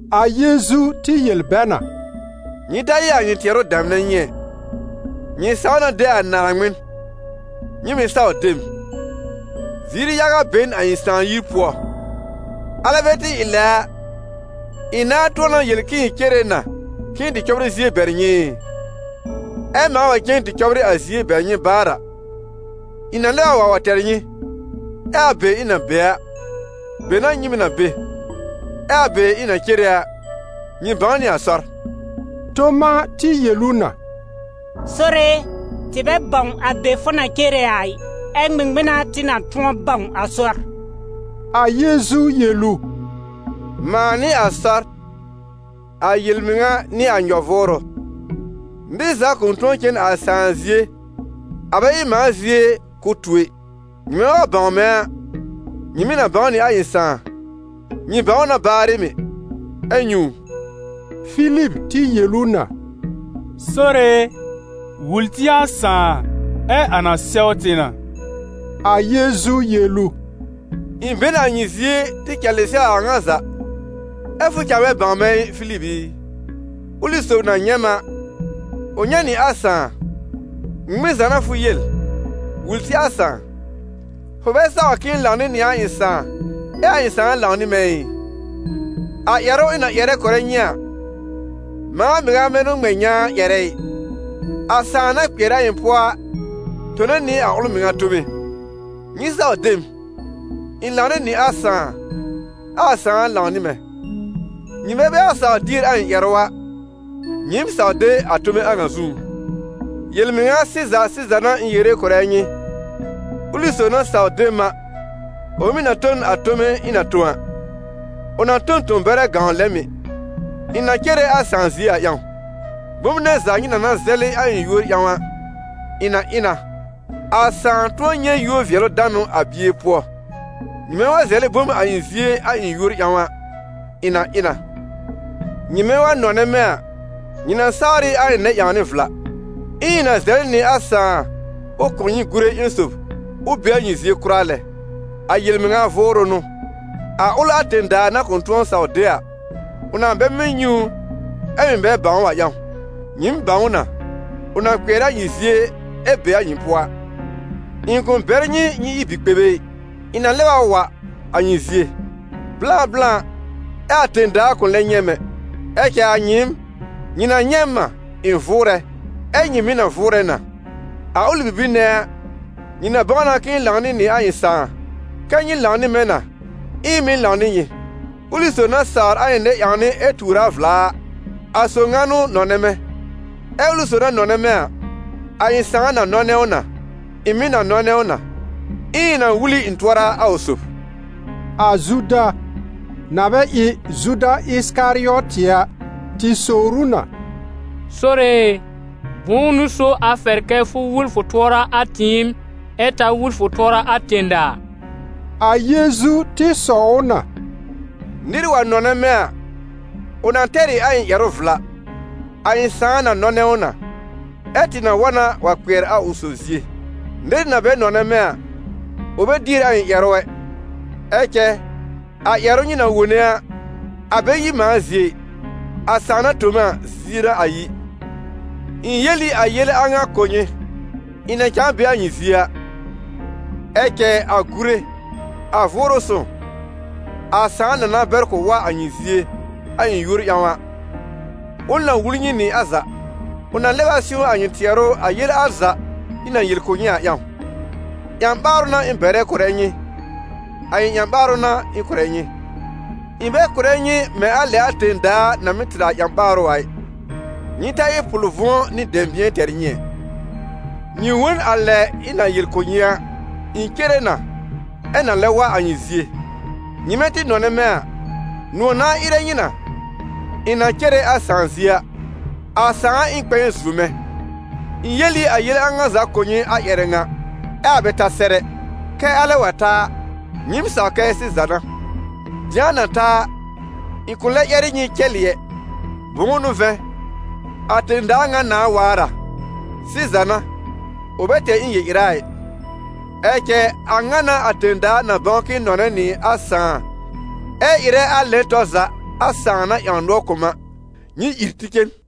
A Yeezu tɩ yel bɛ na: «Nyɩ ta ɩ a nyɩ tɩɛrʋ damnɛ nyɩ ɛ: nyɩ saw na de a Naaŋmɩn, nyɩ mɩ̀ saw de m. Ziir yaga be n a ɩ̃ sãà yir pʋɔ, alɛ bɛ tɩ ɩ lɛ a, ɩ̃ nãá tʋ̃ɔ na yel k'ɩ̃ɩ cere na k'ɩ̃ɩ tɩ cɔbrɩ zie bɛr nyɩ ɩ? Ɛ mãa wa cen tɩ cɔbrɩ a zie bɛr nyɩ baar a, ɩ̃ na lɛb a wa wa tɛr nyɩ, ɛ a be ɩ̃ na be a, be n'a nyɩ mɩ̀ na be. Ɛ a be ɩ̃ na cere a, nyɩ bãw nɩ a sɔr.» Toma tɩ yel ʋ na: «Sore e, tɩ bɛ bãw a be fʋ na cere a ɩ, ɛ ŋmɩŋmɩn n'a tɩ na tʋ̃ɔ bãw a sɔr?» A Yeezu yel ʋ: «Mãa n'ɩ a sɔr, a yel-mɩŋa nɩ a nyɔ-vʋʋrʋ. Nɩr za kʋ̃ tʋ̃ɔ cen a Sãà zie, a bɛ ɩ mãa zie k'ʋ tu ɛ. Nyɩmɛ wa bãw mɛ̃ a, nyɩ mɩ̀ na bãw nɩ a ɩ̃ Sãà, nyɩ bãw ʋ na baarɩ mɩ̀, ɛ nyɛ̃ ʋ.» Filib tɩ yel ʋ na: «Sore e, wul tɩ a Sãà, ɛ a na sɛw tɩ na.» A Yeezu yel ʋ: «Ɩ̃ be n a nyɩ zie tɩ cɛlɩ sɛw a ŋa za, ɛ fʋ cãa bɛ bãw mɛ̃ ɩ, Filib i? Ʋlɩ sob na nyɛ̃ m a, ʋ nyɛ̃ nɩ a Sãà. Ŋmɩŋmɩn za n'a fʋ yel: ‹Wul tɩ a Sãà?› Fʋ bɛ saw k'ɩ̃ɩ lãw nɩ nɩ a ɩ̃ Sãà ɛ a ɩ̃ Sãà lãw nɩ mɛ̃ ɩ? A ƴɛrʋ ɩ̃ na ƴɛrɛ kʋ̀rɛ nyɩ a, mãa mɩŋa bɛ n'ʋ ŋmɛ nyãa ƴɛrɛ ɩ. A Sãà na kpɩɛr a ɩ̃ pʋɔ a tone nɩ a ʋl mɩŋa tome. Nyɩ saw de m, ɩ̃ lãw nɩ nɩ a Sãà, ɛ a Sãà lãw nɩ mɛ̃. Nyɩmɛ bɛ wa sawr dier a ɩ̃ ƴɛrʋ a, nyɩɩm saw de a tome a ŋa zũú. Yel-mɩŋa sɩza sɩza n'a ɩ̃ yere kʋ̀rɛ nyɩ, ʋlɩ sob na saw de m a, ʋ mɩ̀ na tõ n a tome ɩ̃ na tõ a, ʋ na tõ n tõ-bɛrɛ gãw lɛ mɩ̀: ɩ̃ na cere a Sãà zie a ƴãw. Bom nɛ za nyɩ na na zɛlɩ a ɩ̃ yúor ƴãw a, ɩ̃ na ɩ na, a Sãà tʋ̃ɔ nyɛ̃ yúor-vɩɛlʋ-danʋ a Bie pʋɔ. Nyɩmɛ wa zɛlɛ bom a ɩ̃ zie a ɩ̃ yúor ƴãw a, ɩ̃ na ɩ na.» «Nyɩmɛ wa nɔnɛ mɛ̃ a, nyɩ na sawr ɩ a ɩ̃ nɛ-ƴãwnɩ vla. Ɛ ɩ̃ na zɛlɩ nɩ a Sãà ʋ kʋ̀ nyɩ Gure ƴẽn sob ʋ be a nyɩ zie kʋra lɛ. A yel-mɩŋa Vʋʋrʋ n'ʋ, a ʋl a tẽ-daa na kʋ̃ tʋ̃ɔ saw de a, ʋ na bɛ mɩ́ nyɛ̃ ʋ, ɛ mɩ̀ bɛ bãw ʋ a ƴãw. Nyɩɩm bãw ʋ na, ʋ na kpɩɛr a nyɩ zie ɛ be a nyɩ pʋɔ a. Ɩ̃ kʋ̃ bɛr nyɩ nyɩ ɩ bi-kpebe ɩ, ɩ̃ na lɛb a wa a nyɩ zie. Blã blã, ɛ a tẽ-daa kʋ̃ lɛ nyɛ̃ m ɛ. Ɛ cɛ a nyɩɩm, nyɩ na nyɛ̃ m a, ɩ̃ vʋʋrɛ, ɛ nyɩ mɩ̀ na vʋʋrɛ na. A ʋlɩ bibir nɛ a, nyɩ na bãw na k'ɩ̃ɩ lãw nɩ nɩ a ɩ̃ Sãà, kɛ́ nyɩ lãw nɩ mɛ̃ na, ɛ ɩ̃ mɩ̀ lãw nɩ nyɩ. Ʋlɩ sob na sawr a ɩ̃ nɛ-ƴãwnɩ ɛ tuur a vla a, a sob ŋa n'ʋ nɔnɛ mɛ̃. Ɛ ʋlɩ sob na nɔnɛ mɛ̃ a, a ɩ̃ Sãà na nɔnɛ ʋ na, ɩ̃ mɩ̀ na nɔnɛ ʋ na, ɛ ɩ̃ na wul ɩ̃ tʋɔra a ʋ sob.» A Zuda, na bɛ ɩ Zuda Ɩsɩkarɩɔtɩ a, tɩ sowr ʋ na: «Sore e, bʋ̃ʋ n'ʋ so a fɛr kɛ fʋ wul fʋ tʋɔra a tɩɩm, ɛ ta wul fʋ tʋɔra a tẽ-daa?» A Yeezu tɩ sɔw ʋ na: «Nɩr wa nɔnɛ mɛ̃ a, ʋ na tɛr ɩ a ɩ̃ ƴɛrʋ vla, a ɩ̃ Sãà na nɔnɛ ʋ na, ɛ tɩ na wa na wa kpɩɛr a ʋ sob zie. Nɩr na bɛ nɔnɛ mɛ̃ a, ʋ bɛ dier a ɩ̃ ƴɛrʋ ɛ. Ɛ cɛ a ƴɛrʋ nyɩ na wone a, a bɛ yi mãa zie ɩ, a Sãà na tõ m a zie n'a a yi. Ɩ̃ yel ɩ a yele a ŋa kʋ̀ nyɩ, ɩ̃ na cãa be a nyɩ zie a. Ɛ cɛ a Gure, a Vʋʋrʋ Sõw, a Sãà na na bɛr k'ʋ wa a nyɩ zie, a ɩ̃ yúor ƴãw a, ʋl na wul nyɩ nɩ a za. Ʋ na lɛb a sɩ̃w a nyɩ tɩɛrʋ a yele al za ɩ̃ na yel kʋ̀ nyɩ a ƴãw. Ƴã-ɓaarʋ n'a ɩ̃ bɛrɛ kʋ̀rɛ nyɩ, a ɩ̃ ƴã-ɓaarʋ n'a ɩ̃ kʋ̀rɛ nyɩ. Ɩ̃ bɛ kʋ̀rɛ nyɩ mɛ̃ a lɛ a tẽ-daa na mɩ́ tɩr a ƴã-ɓaarʋ a ɩ. Nyɩ ta ɩ pʋl-vʋ̃ɔ nɩ dɛ̃bɩ̃ɛ tɛr nyɩ ɛ. Nyɩ wõ n a lɛ ɩ̃ na yel kʋ̀ nyɩ a, ɩ̃ cere na, ɛ na lɛb wa a nyɩ zie. Nyɩmɛ tɩ nɔnɛ mɛ̃ a, nʋ̃ɔ̀ nãá ɩrɛ nyɩ na, ɩ̃ na cere a Sãà zie a: a Sãà ɩ n kpɛ̃ɛ zuo mɛ̃. Ɩ̃ yel ɩ a yele a ŋa za kʋ̀ nyɩ a ƴɛrɛ ŋa, ɛ a bɛ ta sɛr ɛ, kɛ alɛ wa ta a, nyɩ̃ɩm saw kɛ sɩza n'a. Dɩ̃a na ta a, ɩ̃ kʋ̃ lɛ ƴɛr ɩ nyɩ cɛlɩ ɛ, bʋ̃ʋ n'ʋ vɛ̃, a tẽ-daa ŋa nãà waar a. Sɩza n'a, ʋ bɛ tɛr ɩ̃ yel-ɩra ɩ, ɛ cɛ a ŋa n'a a tẽ-daa na bãw k'ɩ̃ɩ nɔnɛ nɩ a Sãà ɛ ɩrɛ a lɛn tɔr za a Sãà na ƴãw nʋɔr kʋ̀ m a. Nyɩ ìr tɩ cen!»